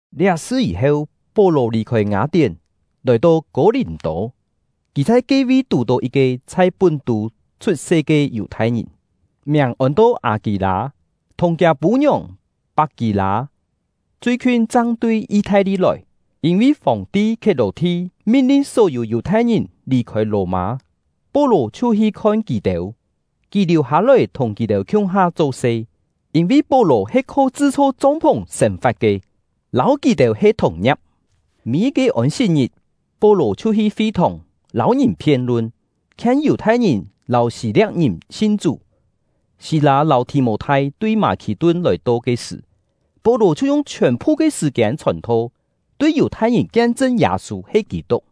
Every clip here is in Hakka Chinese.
Liá sṳ yî-heu, Pó-lò lì-khôi Ngâ-tién, lòi-to Kô-lìm-tô. Kì chhai ke-vi tù-tó yit-ke chhai Pún-tû chhut-se ke Yù-thai-ngìn, miàng ôn-to Â-kî-lâ, thùng kiâ pû-ngiòng Pak-kî-lâ chui-khiun chang tui Yi-thai-li lòi, yîn-vi Fòng-ti Khiet-lò-thi min-lin só-yû Yù-thai-ngìn lì-khôi Lò-mâ. Pó-lò chhiu hi khon kì-têu. Kì liù-hâ-lòi thùng kì-têu khiung-ha cho-se, yîn-vi Pó-lò he kho chṳ-chho chong-phùng sên-fa̍t ke, lâu kì-têu he thùng-ngia̍p. Mî-yit-ke Ôn-sit-ngit, Pó-lò chhiu hi fi-thòng, lâu ngìn phien-lun, khien Yù-thai-ngìn lâu Hî-lia̍p-ngìn sin Chú. Sî-lâ lâu Thì-mô-thai tui Mâ-khì-tun lòi-to ke sṳ̀, Pó-lò chhiu yung chhiòn-phu ke sṳ̀-kiên chhòn-tho, tui Yù-thai-ngìn kien-chṳn Yâ-sû he Kî-tuk.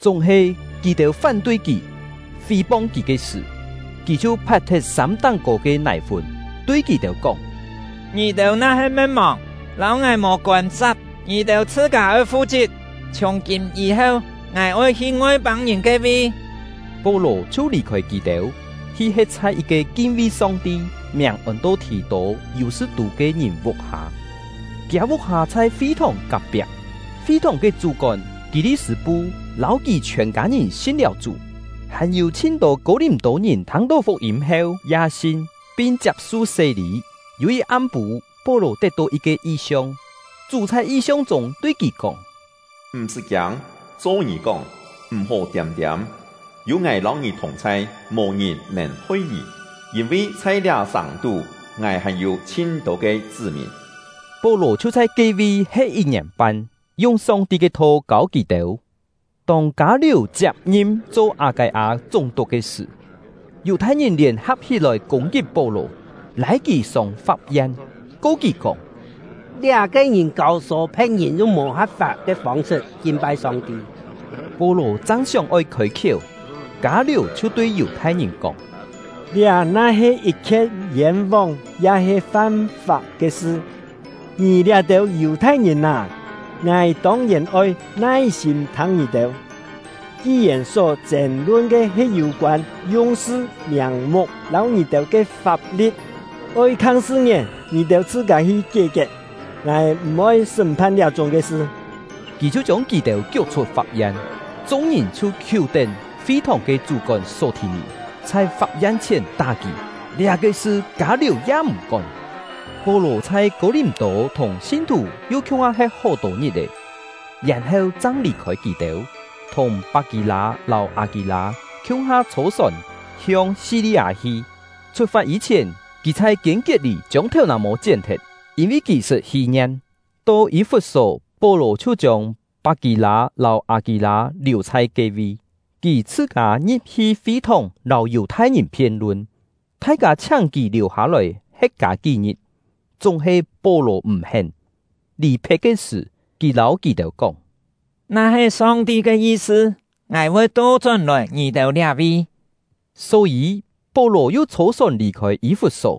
Chúng-he, kì-têu fán-tui kì, fí-pong kì ke sṳ̀, kì chhiu pha̍t-thet sâm táng-kô ke nài-fún, tui kì-têu kóng: “Ngì-têu na-he me̍t-mòng, lâu ngài mò kôn-sa̍p, ngì-têu chhṳ-kâ oi fu-chit! Chhiùng-kîm yî-heu, ngài oi hi Ngoi-pâng-ngìn ke-vi.” Pó-lò chhiu lì-khôi kì-têu, hi he̍t chhai yit-ke kin-vi Song-ti, miàng ôn-to Thì-tô-Yù-sṳ-tû ke ngìn vuk-hâ, kiâ vuk-hâ chhai fi-thòng kak-piak. Fi-thòng ke chú-kón Kî-li-sṳ̂-pu lâu kì chhiòn kâ-ngìn sin-liáu Chú; hàn-yû chhin-tô Kô-lìm-tô-ngìn thâng-tó fuk-yîm heu ya sin, pin chiap-su sé-lî. Yû yit am-pû, Pó-lò tet-tó yit-ke yi-siong. Chú chhai yi-siong chûng tui kì kóng: “M̀-sṳ́ kiâng, cho ngì kóng, m̀-hó tiâm-tiâm, yû Ngài lâu ngì thùng-chhai, mò-ngìn nèn hoi ngì, yîn-vi chhai liá sàng-tú Ngài hàn-yû chhin-tô ke chṳ́-mìn.” Pó-lò chhiu chhai ke-vi he̍t yit-ngièn-pan, yung Song-ti ke tho kâu kì-têu. Tông Kâ-liù chiap-ngim cho Â-kâi-â chúng-tuk ke sṳ̀, Yù-thai-ngìn lièn-ha̍p hí-lòi kûng-kit Pó-lò, lâi kì sông fap-yen, ko kì kóng: “Liá-ke ngìn kâu-sô phe̍t-ngìn yung mò ha̍p-fap ke fông-sṳt kin-pai Song-ti!” Pó-lò chang sióng-oi khôi-khiéu, Kâ-liù chhiu tui Yù-thai-ngìn kóng: “Liá na-he yit-khien yên-vóng ya-he fam-fap ke sṳ, ngì liá-têu Yù-thai-ngìn â, ngài tông-yèn oi nai-sîm thâng ngì-têu; ki-yèn só chên-lun ke he yû-koân yung-sṳ, miàng-muk lâu ngì-têu ke fap-li̍t, oi khang sṳ-ngién ngì-têu chhṳ-kâ hi kié-kiet. Ngài m̀-oi sṳ́m-phan liá-chúng ke sṳ!” Kì chhiu chiông kì-têu kiuk-chhut fap-yen. Chung-ngìn chhiu khiú-tén fi-thòng ke chú-kón Só-thì-nì, chhai fap-yen chhièn tá kì. Liá-ke sṳ, Kâ-liù ya m̀ kón. Pó-lò chhai Kô-lìm-tô thùng sin-thù yu khiung-ha he̍t hó-tô ngit-è, yèn-heu chang lì-khôi kì-têu, thùng Pak-kî-lâ lâu Â-kî-lâ khiung-ha chhô-sòn hiong Si-li-â hi. Chhut-fat yî-chhièn, kì chhai Kiên-kiet-lî chiông thèu-nà-mô chién-thet, yîn-vi kì sṳt hí-ngien. To Yî-fut-só, Pó-lò chhiu chiông Pak-kî-lâ lâu Â-kî-lâ liù chhai ke-vi. Kì chhṳ-kâ ngi̍p-hi fi-thòng lâu Yù-thai-ngìn phien-lun. Thai-kâ chhiáng kì liù-hâ-lòi he̍t kâ kí-ngit, chúng-he Pó-lò m̀ hén. Lì-phe̍t ke sṳ̀, kì lâu kì-têu kóng: “Na-he Song-ti ke yi-sṳ, ngài voi to-chón-lòi ngì-têu liá-vi.” Só-yî, Pó-lò yu chhô-sòn lì-khôi Yî-fut-só.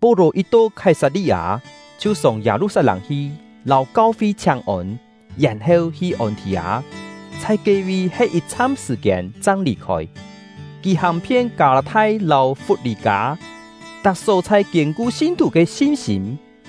Pó-lò yit-to Khái-sat-li-â, chhiu sông Yâ-lu-sat-lâng hi lâu kau-fi chhiáng-ôn, yèn-heu hi Ôn-thì-â, chhai ke-vi he̍t yit-chham sṳ̀-kiên chang lì-khôi. Kì hàng-phien Kâ-lâ-thai lâu Fut-lî-kâ, tak só-chhai kiên-ku sin-thù ke sin-sîm.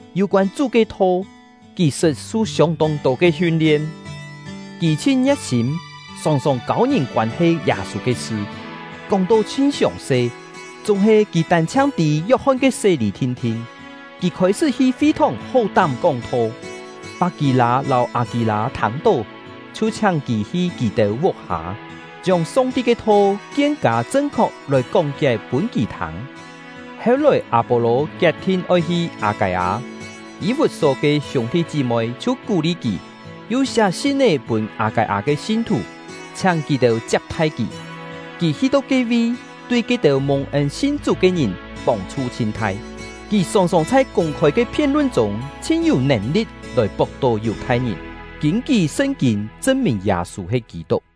Yû-koân Chú ke Tho, kì sṳt su siông-tông tô ke hiun-lien. Kì chhin ngie̍t-sîm, sòng-sòng kâu-ngìn koân-he Yâ-sû ke sṳ, kóng-to chhin siòng-se. Chúng-he, kì tân-chhiang tî Yok-hon ke sé-lî thin-thin. Kì khôi-sṳ́ hi fi-thòng hó-tám kóng-tho; Pak-kî-lâ lâu Â-kî-lâ thâng-tó, chhiu chhiáng kì hi kì-têu vuk-hâ, chiông Song-ti ke Tho kien-kâ chṳn-khok lòi kóng-kié pûn kì thâng. Heu-lòi, Â-pô-lò kiet-thin oi hi Â-kâi-â, Yî-fut-só ke hiûng-thi chí-moi chhiu kú-li kì, yu siá sin-é pûn Â-kâi-â ke sin-thù, chhiáng kì-têu chiap-thai kì. Kì hi-to ke-vi, tui ke-têu mùng-ên sin Chú ke ngìn pông-chhu chhin thai. Kì sòng-sòng chhai kûng-khôi ke phien-lun chûng chhin-yû nèn-li̍t lòi pok-tó Yù-thai-ngìn, kîn-kí Sṳn-kîn chṳn-mìn Yâ-sû he Kî-tuk.